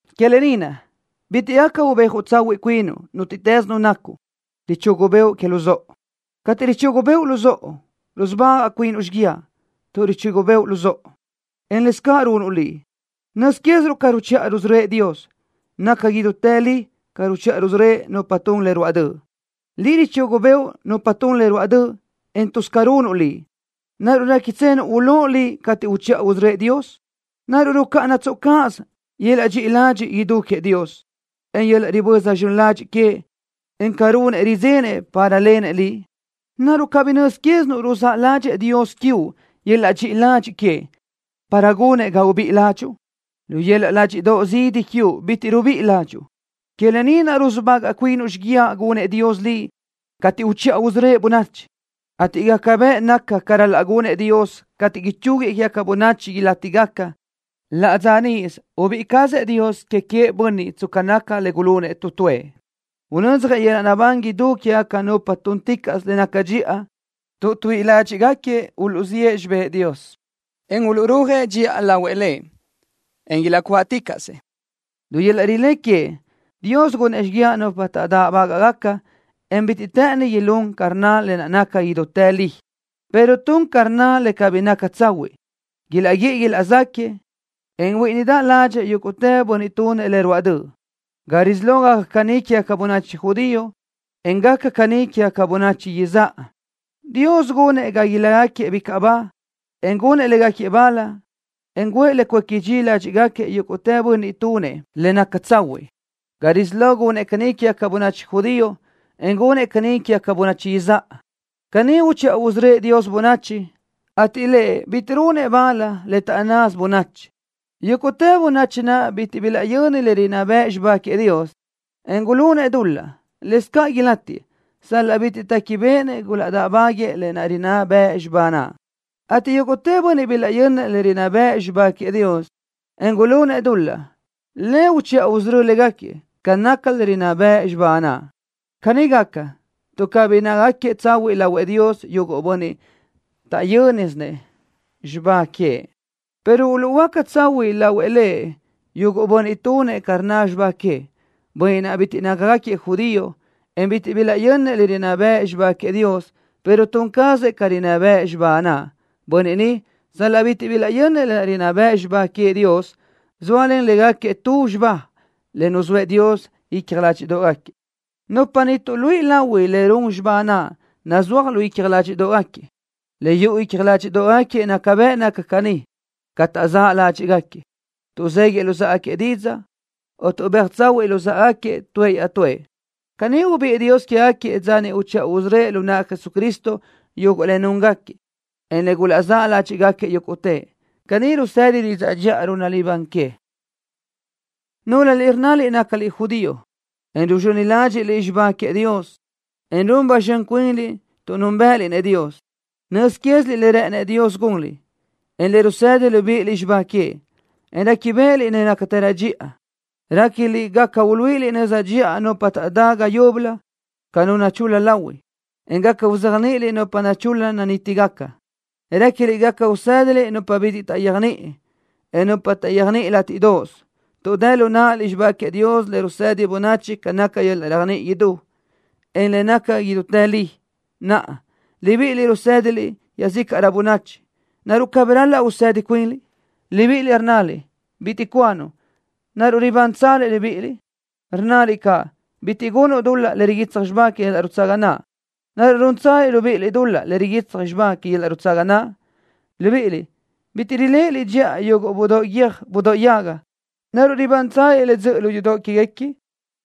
Que lë ni naʼ, bitiʼ gaca ubéaj tsahuiʼ cuinuʼ, nútiʼtës nu nacuʼ, richugu bëʼu luzóʼo. Cateʼ richugu bëʼu luzóʼo, rusubagaʼ cuinuʼ xíguiaʼ, tuʼ richugu bëʼu luzóʼo, en lëscaʼ runuʼ liʼ. Nöz quéziruʼ ca ruchiʼa rusörö́ëʼ Dios. Naca idútë li ca ruchiʼa rusörö́ëʼ nupa tun le ruáʼ döʼ. Liʼ richugu bëʼu nupa tun le ruáʼ döʼ, en tuz ca runuʼ liʼ. ¿Naruʼ réquitsenuʼ ulóʼ liʼ cateʼ uchiʼa usörö́ëʼ Dios? ¿Naruʼ rucáʼanatsoʼ cáʼasö yöl-laʼ dxiʼi ladxiʼ idú queëʼ Dios, en yöl-laʼ riböza zxön ladxiʼ queëʼ, en ca runëʼ, ridzenëʼ para lenëʼ liʼ? ¿Naruʼ cabí nöz quézinuʼ ruzáʼ ládxëʼë Dios quiuʼ yöl-laʼ dxiʼi ladxiʼ queëʼ para gunëʼ ga ubíʼi ládxuʼu? Lu yöl-laʼ ládxiʼdoʼ zidi quiuʼ bitiʼ rubíʼi ládxuʼu. Que lë ni naʼ rusubagaʼ cuinuʼ xíguiaʼ gunëʼ Dios liʼ cateʼ uchiʼa usörö́ëʼ bönachi, ateʼ gaca bëʼ naca ca ral-laʼ gunëʼ Dios cateʼ ichúguiëʼ quégaca bönachi ilátigaca. Laʼ dza níʼisö ubíʼi cazëʼ Dios que queëʼ bönniʼ tsca naca le gulunëʼ tu tuëʼ. Unödzjëʼ yöl-laʼ naʼbán idú quégaca nupa túnticaʼsö le naca dxiʼa, tuʼ tuíʼi ládxiʼgaquiëʼ uluʼziʼë xibë́ʼ Dios, en uluʼrúajëʼ dxiʼa lahuëʼ Lëʼ, en ilaʼcuáʼticaʼsëʼ. Lu yöl-laʼ rilé queëʼ, Dios gunëʼ xíguiaʼ nupa taʼdáʼbagaʼ, en bitiʼ të́ʼëni ilún ca rnna le naca idútë li, pero tun ca rnna le cabí naca tsahuiʼ. Ilaʼguíʼi ilaʼzáquiëʼ, en huíʼinidaʼ ládxëʼë yúguʼtë bönniʼ tunëʼ le ruáʼ döʼ. Ga risí lo gaca caní quégaca bönachi judío, en gaca caʼ caní quégaca bönachi izáʼa. Dios gunëʼ ga ilácagaquiëʼ bicaʼ ba, en gunëʼ légaquiëʼ bal, en guʼë le cuéqui dxi ládxiʼgaquiëʼ yúguʼtë bönniʼ tunëʼ le naca tsahuiʼ. Ga risí lo gunëʼ caní quégaca bönachi judío, en gunëʼ caʼ caní quégaca bönachi izáʼa. Caní uchiʼa usörö́ëʼ Dios bönachi, ateʼ Lëʼ bitiʼ runëʼ bal le taʼnnasö bönachi. Yúguʼtë bönniʼ naʼ bitiʼ bilaʼyönnëʼ le rinná bëʼ xibá queëʼ Dios, en gulunëʼ dul-laʼ, lëscaʼ ilátiëʼ, sal-laʼ bitiʼ téquibeʼenëʼ gulaʼdáʼbaguëʼë le rinná bëʼ xibá naʼ, ateʼ yúguʼtë bönniʼ bilaʼyönnëʼ le rinná bëʼ xibá queëʼ Dios, en gulunëʼ dul-laʼ, Lëʼ uchiʼa usörö́ëʼ légaquiëʼ ca naca le rinná bëʼ xibá naʼ. Caní gaca, tuʼ cabí nácagaquiëʼ tsahuiʼ lahuëʼ Dios yuguʼ bönniʼ taʼyö́nisëʼ xibá queëʼ, pero uluʼhuöáca tsahuiʼ lahuëʼ Lëʼ yuguʼ bönniʼ tunëʼ ca rnna xibá queëʼ. Bönniʼ naʼ bitiʼ nácagaquiëʼ judío, en bitiʼ bilaʼyönnëʼ le rinná bëʼ xibá queëʼ Dios, pero tun cazëʼ ca rinná bëʼ xibá queëʼ naʼ, bönniʼ ni, sal-laʼ bitiʼ bilaʼyönnëʼ le rinná bëʼ xibá queëʼ Dios, zóalen légaquiëʼ tu xibá le nuzóëʼ Dios icja ládxiʼdoʼgaquiëʼ. Nupa ni tuʼluíʼi lahui le run xibá naʼ nazúaj lu icja ládxiʼdoʼgaquiëʼ. Le yuʼu icja ládxiʼdoʼgaquiëʼ naca bëʼ naca caní. Ca taʼzáʼ ládxiʼgaquiëʼ, tuʼzéguiëʼ luzáʼagaquiëʼ didzaʼ, o tuʼbéaj tsahuiʼ luzáʼagaquiëʼ tuëʼ iaʼtúëʼ. Caní ubiʼë Dios quégaquiëʼ dza niʼ uchiʼa usörö́ëʼ lu naʼ Jesucristo yuguʼ le núngaquiëʼ, en le gulaʼzáʼ ládxiʼgaquiëʼ yúguʼtëʼ. Caní rusëdi didzaʼ dxiʼa runaʼ libán que. Núlöliʼ rnnaliʼ nácaliʼ judío, en ruzxöni ládxiʼliʼ xibá queëʼ Dios, en run ba zxön cuinliʼ tuʼ núnbëʼëliʼ-nëʼ Dios, nöz quéziliʼ le rë́ʼënëʼ Dios gunliʼ, en le rusëdi libíʼiliʼ xibá queëʼ, en réquibeʼeliʼ le nácatërö dxiʼa. Réquiliʼ gaca uluíʼiliʼ nöza dxiʼa nupa taʼdá ga yúbölö ca nu nachul-la lahui, en gaca uzéajniʼiliʼ nupa nachul-la nanítigaca. Réquiliʼ gaca usë́diliʼ nupa bitiʼ taʼyéajniʼi, en nupa taʼyéajniʼi látiʼdoʼos, tuʼ dë lu náʼaliʼ xibá queëʼ Dios le rusëdi bönachi ca naca yöl-laʼ réajniʼi idú, en le naca idútë li. Naʼa, libíʼiliʼ rusë́diliʼ iaʼzícaʼrö bönachi. ¿Naruʼ cabí ral-laʼ usëdi cuinliʼ? Libíʼiliʼ rnnaliʼ: “Bitiʼ cuanuʼ.” ¿Naruʼ ribántsaliʼ libíʼiliʼ? Rnnaliʼ caʼ: “Bitiʼ gunuʼ dul-laʼ le riguitsaj xibá que yöl-laʼ nutsaga naʼ.” ¿Naruʼ rúntsaliʼ libíʼiliʼ dul-laʼ le riguitsaj xibá que yöl-laʼ nutsaga naʼ? Libíʼiliʼ bitiʼ riléʼeliʼ dxiʼa yuguʼ budóʼ guiö́j budóʼ yaga. ¿Naruʼ ribántsaliʼ le dzöʼö lu yudoʼ quéguequi?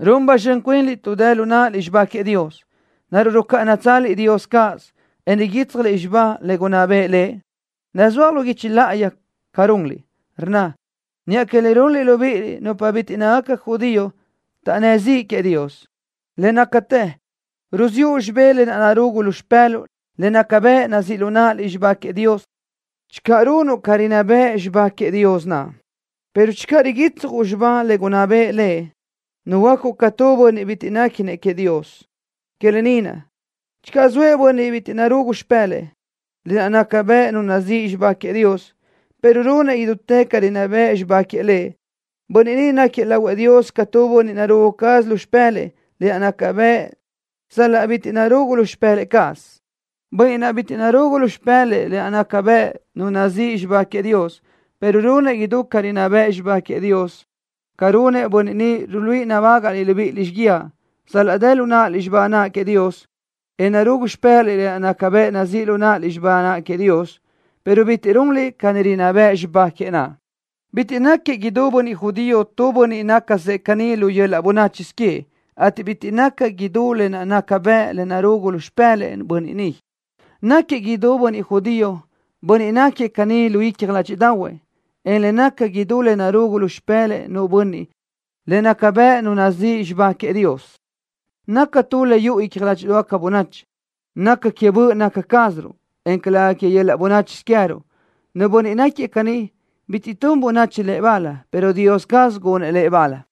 Run ba zxön cuinliʼ tuʼ dë lu náʼaliʼ xibá queëʼ Dios. ¿Naruʼ rucáʼanatsaliʼ Dios cáʼasö, en riguítsjaliʼ xibá le gunná bëʼë Lëʼ? Nazúaj lu guichi láʼayi ca runliʼ, rnna: Niʼa que le runliʼ libíʼiliʼ nupa bitiʼ nácagaca judío taʼnnë́ ziʼ queëʼ Dios. Le nácatë ruziʼu xibé lë naʼ narugu lu xipë́luʼu le naca bëʼ nazíʼ lu náʼaliʼ xibá queëʼ Dios channö runuʼ ca rinná bëʼ xibá naʼ queëʼ Dios, pero channö riguitsjuʼ xibá le gunná bëʼë Lëʼ, nuhuöácuʼ ca tu bönniʼ bitiʼ néquinëʼ queëʼ Dios. Que lë ni naʼ, channö zoëʼ tu bönniʼ bitiʼ narugu lu xipë́lëʼë lë naʼ naca bëʼ nu nazíʼi xibá queëʼ Dios, pero runëʼ idútë ca rinná bëʼ xibá queëʼ Lëʼ, bönniʼ ni náquiëʼ lahuëʼ Dios ca tu bönniʼ narugu caz lu xipë́lëʼë lë naʼ naca bëʼ sal-laʼ bitiʼ narugu lu xipëlaʼ cazëʼ. Bönniʼ naʼ bitiʼ narugu lu xipë́lëʼë lë naʼ naca bëʼ nu nazíʼi xibá queëʼ Dios, pero runëʼ idú ca rinná bëʼ xibá naʼ queëʼ Dios, ca runëʼ bönniʼ ni ruluíʼi nabágaʼliʼ libíʼiliʼ xíguiaʼ, sal-laʼ dë lu náʼaliʼ xibá naʼ queëʼ Dios, en narugu lu xipë́laʼliʼ lë naʼ naca bëʼ nazíʼ lu náʼaliʼ xibá naʼ queëʼ Dios, pero bitiʼ runliʼ ca rinná bëʼ xibá queëʼ naʼ. Bitiʼ náquiëʼ idú bönniʼ judío tu bönniʼ nácasëʼ caní lu yöl-laʼ bönáchisö queëʼ, ateʼ bitiʼ naca idú lë naʼ naca bëʼ le narúgusö lu xipë́lëʼë nu bönniʼ. Náquiëʼ idú bönniʼ judío bönniʼ naʼ náquiëʼ caní lu icja ládxiʼdaʼahuëʼ, en le naca idú le narugu lu xipë́lëʼë nu bönniʼ le naca bëʼ nu nazíʼi xibá queëʼ Dios, naca tu le yuʼu icja ládxiʼdoʼgaca bönachi. Naca que böʼ naca cázaruʼ, en calëga que yöl-laʼ bönáchisö queë́ruʼ. Nu bönniʼ náquiëʼ caní, bitiʼ tun bönachi lëʼ bal, pero Dios caz gunëʼ lëʼ bal.